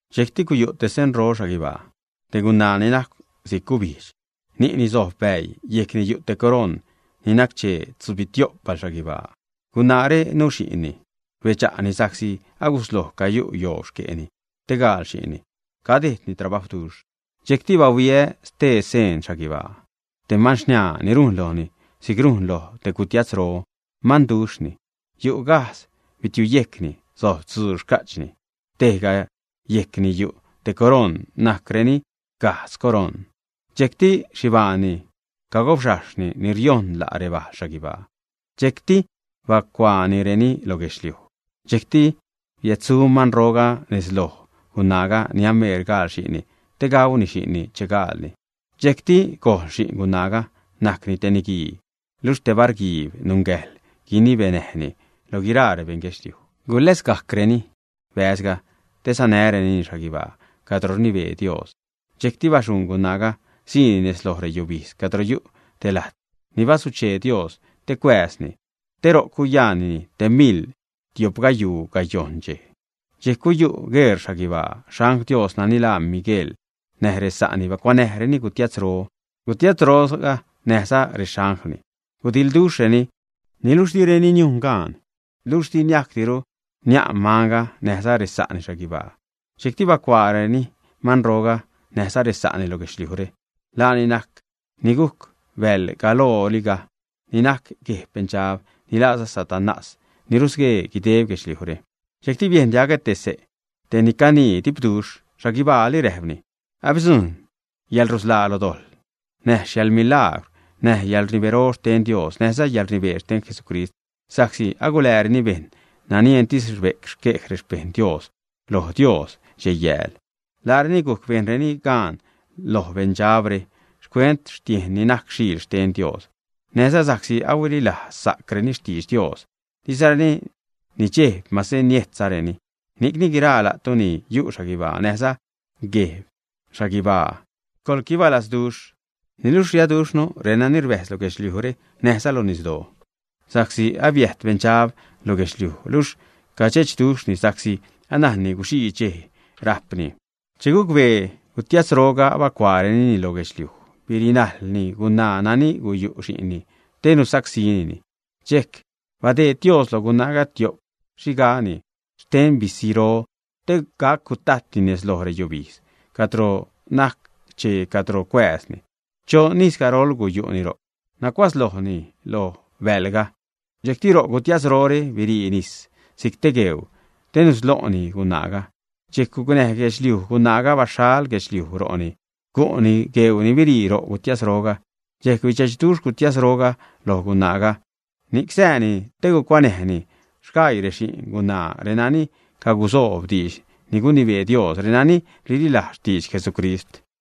Dxejcti guyu' te senro xhaguibaa: te gunaa ni najcw si'c gubijdx, ni'ni sojb bäii, yejcni yu' te coroṉ ni nac-chee tzubitio'p balxhaguibaa. Gunaare nuxi'nni. Rbedxa'ni sa'csi agusloj cayu' yoob xque'ni te gaal xi'nni, cadejdni trabajwduxh. Dxejcti bahuiä stee seen xhaguibaa: te manxniaa ni rujn lojni si'c loj te gutiatzro, manduxhni. Yu' gajdz bitiuyejcni, sojb tzuu xca'chni. Tejga yejcni yu' te coroṉ, najcreni gajdz coroṉ. Dxejcti xhibaanni cagobxajxhni ni riojṉ la' rebalxhaguibaa, dxejcti bacuaanireni lo guedxliuj. Dxejcti biädsu manroga nez loj gunaaga ni ameer gaal xi'nni, te gauni xi'nni che gaalni. Dxejcti gojl xi'n gunaaga, najcni te niguii, luxh te bar guiib nungäjḻ guinibenäjni lo guiraa rebeṉ guedxliuj. Guläsgajcreni bäzga te sanärenini xhaguibaa cadro rnibee Dios. Dxejcti baxuṉ gunaaga, siini nez loj reyubijdz cadro yu' te lajt ni basuchee Dios te cuääzni, te ro'c guyaannini te miḻ tio'p gayuu gayojṉ dxej. Dxejc guyu' gueṟ xhaguibaa, xangl Dios nani laa Miguejl näj resa'ni bacuanäjreni gutiatzro. Gutiatzroga näjza rexanglni gudiḻduxhreni, niluxh direni niujn gaan, luxh di niajcdiru nia'n manga näjza resa'ni xhaguibaa. Dxejcti bacuaareni manroga näjza resa'ni lo guedxliujre. Laani najc ni gujc bäḻ galoroga, ni najc gueb Beṉdxab, ni laaza Satanás, ni rusguee guideb guedxliujre. Dxejcti biejn diagä xse' te ni canii dipduxh xhaguibaali, räjpni: ―Abidzujṉ yäḻrusḻaa lo dojḻ, näj yäḻmilagwr, näj yäḻrnibero xten Dios, näjza yäḻrnibee xten Jesucrist, sa'csi agulääreni bejṉ nani entis rbe'c xquej rexpejṉ Dios loj Dios dxej-yääl. Laareni gujc bejnreni gaan loj beṉdxabre, xcuent xtiejn ni najc Xiil xten Dios, näjza sa'csi huililazsa'creni xtidx Dios, dizareni nidxejb mase niejtzareni. Ni'cni, guiraa la'tu ni yu' xhaguibaa näjza gueb xhaguibaa, coḻquibalazduxh. Niluxh riaduxhnu renani rbäjz lo guedxliujre, näjza lo nisdoo, sa'csi abiäjt beṉdxab lo guedxliuj, luxh cadxechduxhni sa'csi anajnni guxii dxej rajpni. Che gucbee gutiatzroga abacuaarenini lo guedxliuj, birinajlni gunaa nani guyu' xi'ngaanni te gusacsínini. Dxejc badeed Dios lo gunaaga tio'p xhiga xten bisiro, te gac gutajtni nez lo reyubijdz cadro nac-chee cadro cuääzni. Choṉ ijz garol guyu'ni ro'c, nacuatzlojni lo bäḻga. Dxejcti ro' gutiatzrore birii nis si'c te gueuu te nuslo'ni gunaaga. Dxejc gucnäj guedxliuj gunaaga, baxhal guedxliuj ro'ni, gu'ni gueuu ni birii ro' gutiatzroga. Dxejc bidxechduxh gutiatzroga loj gunaaga, ni'c sääni te gucuanäjni sgaii rexi'n gunaaga, renani cagusoob diidx ni gunibee Dios, renani rililajzza xtidx Jesucrist.